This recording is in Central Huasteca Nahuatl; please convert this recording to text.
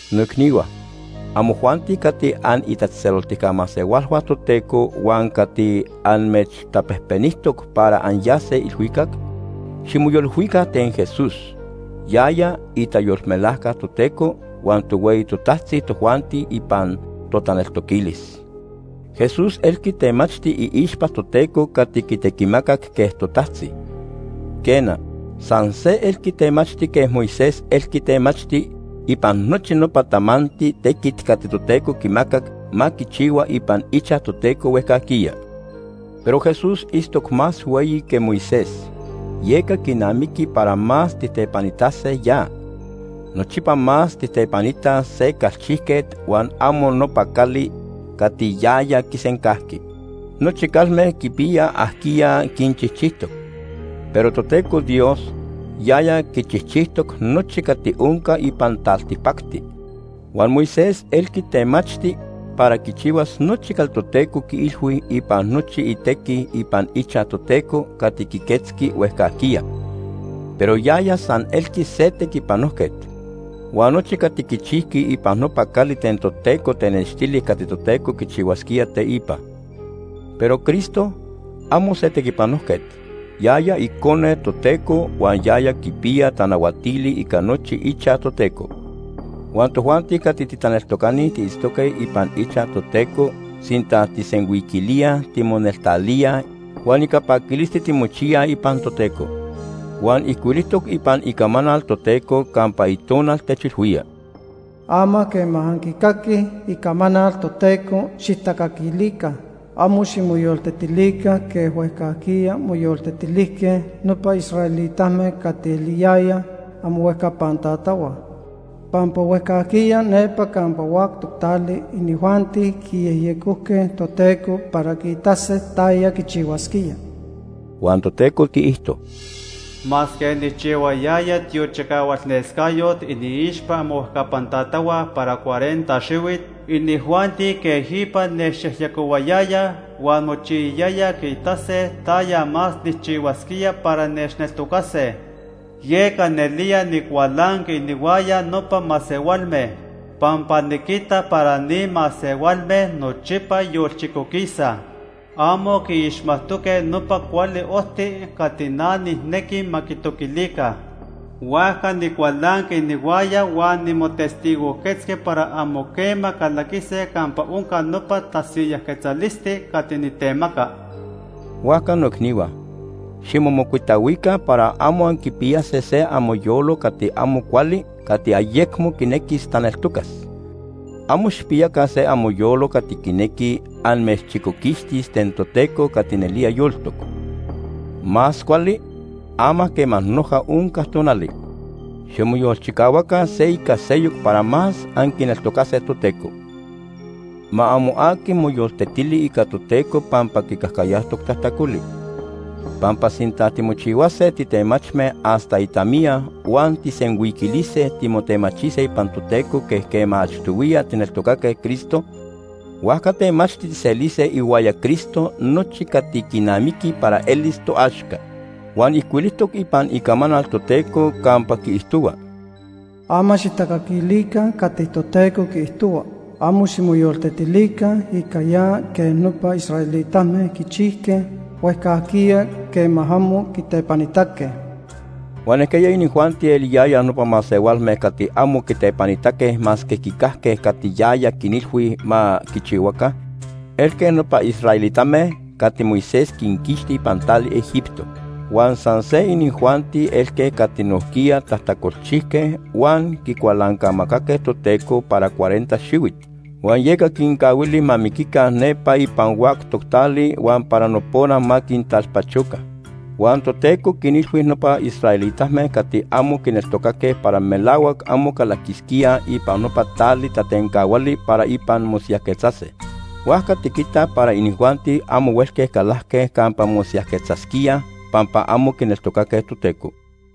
Noicnihua, amojuanti cati anitatzejtzeloltica masehualhua Toteco huan cati amechtapejpenijtoc para anyase ilhuicac, ximoyolilhuica ten Jesús, yaya itayolmelajca Toteco huan tohueyi totajtzi tojuanti ipan totaneltoquilis. Jesús elqui temachti iixpa Toteco cati quitequimacac quej totajtzi. Quena, san se elqui temachti quej Moisés elqui temachti ipan nochi nopa tamanti tequit cati Toteco quimacac ma quichihua ipan ichaj Toteco huejcajquiya. Pero Jesús itztoc más hueyi que Moisés, yeca quinamiqui para más tijtepanitase ya. Nochipa más tijtepanitaj se calchijquet huan amo nopa cali cati yaya quisencajqui. Nochi calme quipiyaj ajquiya quinchijchijtoc, pero Toteco Dios, yaya quichijchijtoc nochi cati onca ipan taltipacti. Huan Moisés elqui temachti para quichihuas nochi cati Toteco quiilhui ipan nochi itequi ipan ichaj Toteco cati quiquetzqui huejcajquiya, pero yaya san elqui se tequipanojquet. Huan nochi cati quichijqui ipan nopa cali ten Toteco tenextili cati Toteco quichihuasquía teipa. Pero Cristo, amo se tequipanojquet, yaya Icone Toteco huan yaya quipiya tanahuatili ica nochi ichaj Toteco. Huan tojuanti cati titaneltocani tiitztoque ipan ichaj Toteco sinta tijsenhuiquilíaj timoneltalíaj huan ica paquilisti timochiyaj ipan Toteco. Huan ijcuilijtoc ipan Icamanal Toteco campa Itonal techilhuía: “Ama quema anquicaquij icamanal Toteco, xijtacaquilica. Amo ximoyoltetilica quej huejcajquiya moyoltetilijque nopa israelitame cati eliyayaj amohuejcapan tatahua. Pampa huejcajquiya nepa campa huactoc tali inijuanti quiyejyecojque Toteco para quiitase taya quichihuasquía.” (Huan Toteco quiijto:) “Masque nijchihuayaya tiochicahualnescayot iniixpa amohuejcapan tatahua para cuarenta xihuit, inijuanti quejipa nechyejyecohuayayaj huan mochiyayayaj quiitase taya más nijchihuasquía para nechneltocase. Yeca nelía nicualanqui inihuaya nopa masehualme, pampa niquitac para ni masehualme nochipa yolchicoquisaj. Amo quiixmajtoque nopa cuali ojti cati na nijnequi ma quitoquilica. Huajca nicualanqui inihuaya huan nimotestigojquetzqui para amo quema calaquise campa onca nopa tasiyajquetzalisti cati nitemaca.” Huajca noicnihua, ximomocuitahuica para amo anquipiyase se amoyolo cati amo cuali cati ayecmo quinequis taneltocas. Amo xijpiyaca se amoyolo cati quinequi amechchicoquixtis ten Toteco cati nelía yoltoc. Más cuali, ama quema noja onca tonali, ximoyolchicahuaca se ica seyoc para más anquineltocase Toteco. Ma amo aqui moyoltetili ica Toteco pampa quicajcayajtoc tajtacoli. Pampa sinta timochihuase titemachme hasta itamiya huan tijsenhuiquilise timotemachise ipan Toteco quej quema achtohuiya tijneltocaque Cristo, huajca temachti tijselise ihuaya Cristo nochi cati quinamiqui para elis toaxca. Huan ijcuilijtoc ipan Icamanal Toteco campa quiijtohua: “Ama xijtacaquilica cati Toteco quiijtohua. Amo ximoyoltetilica ica ya quej nopa israelitame quichijque huejcajquiya quema amo quitepanitaque.” Huan ¿ajquiya inijuanti eliyayaj nopa masehualme cati amo quitepanitaque masque quicajque cati yaya quinilhui ma quichihuaca? Elque nopa israelitame cati Moisés quinquixti ipan tali Egipto. Huan san se inijuanti elque cati nojquiya tajtacolchijque huan quicualancamacaque Toteco para cuarenta xihuit, huan yeca quincahuili ma miquica nepa ipan huactoc tali huan para nopona ma quintalpachoca. Huan Toteco quinilhui nopa israelitame cati amo quineltocaque para melahuac amo calaquisquíaj ipan nopa tali tatencahuali para ipan mosiyajquetzase. Huajca tiquitaj para inijuanti amo huelque calajque campa mosiyajquetzasquíaj pampa amo quineltocaque Toteco.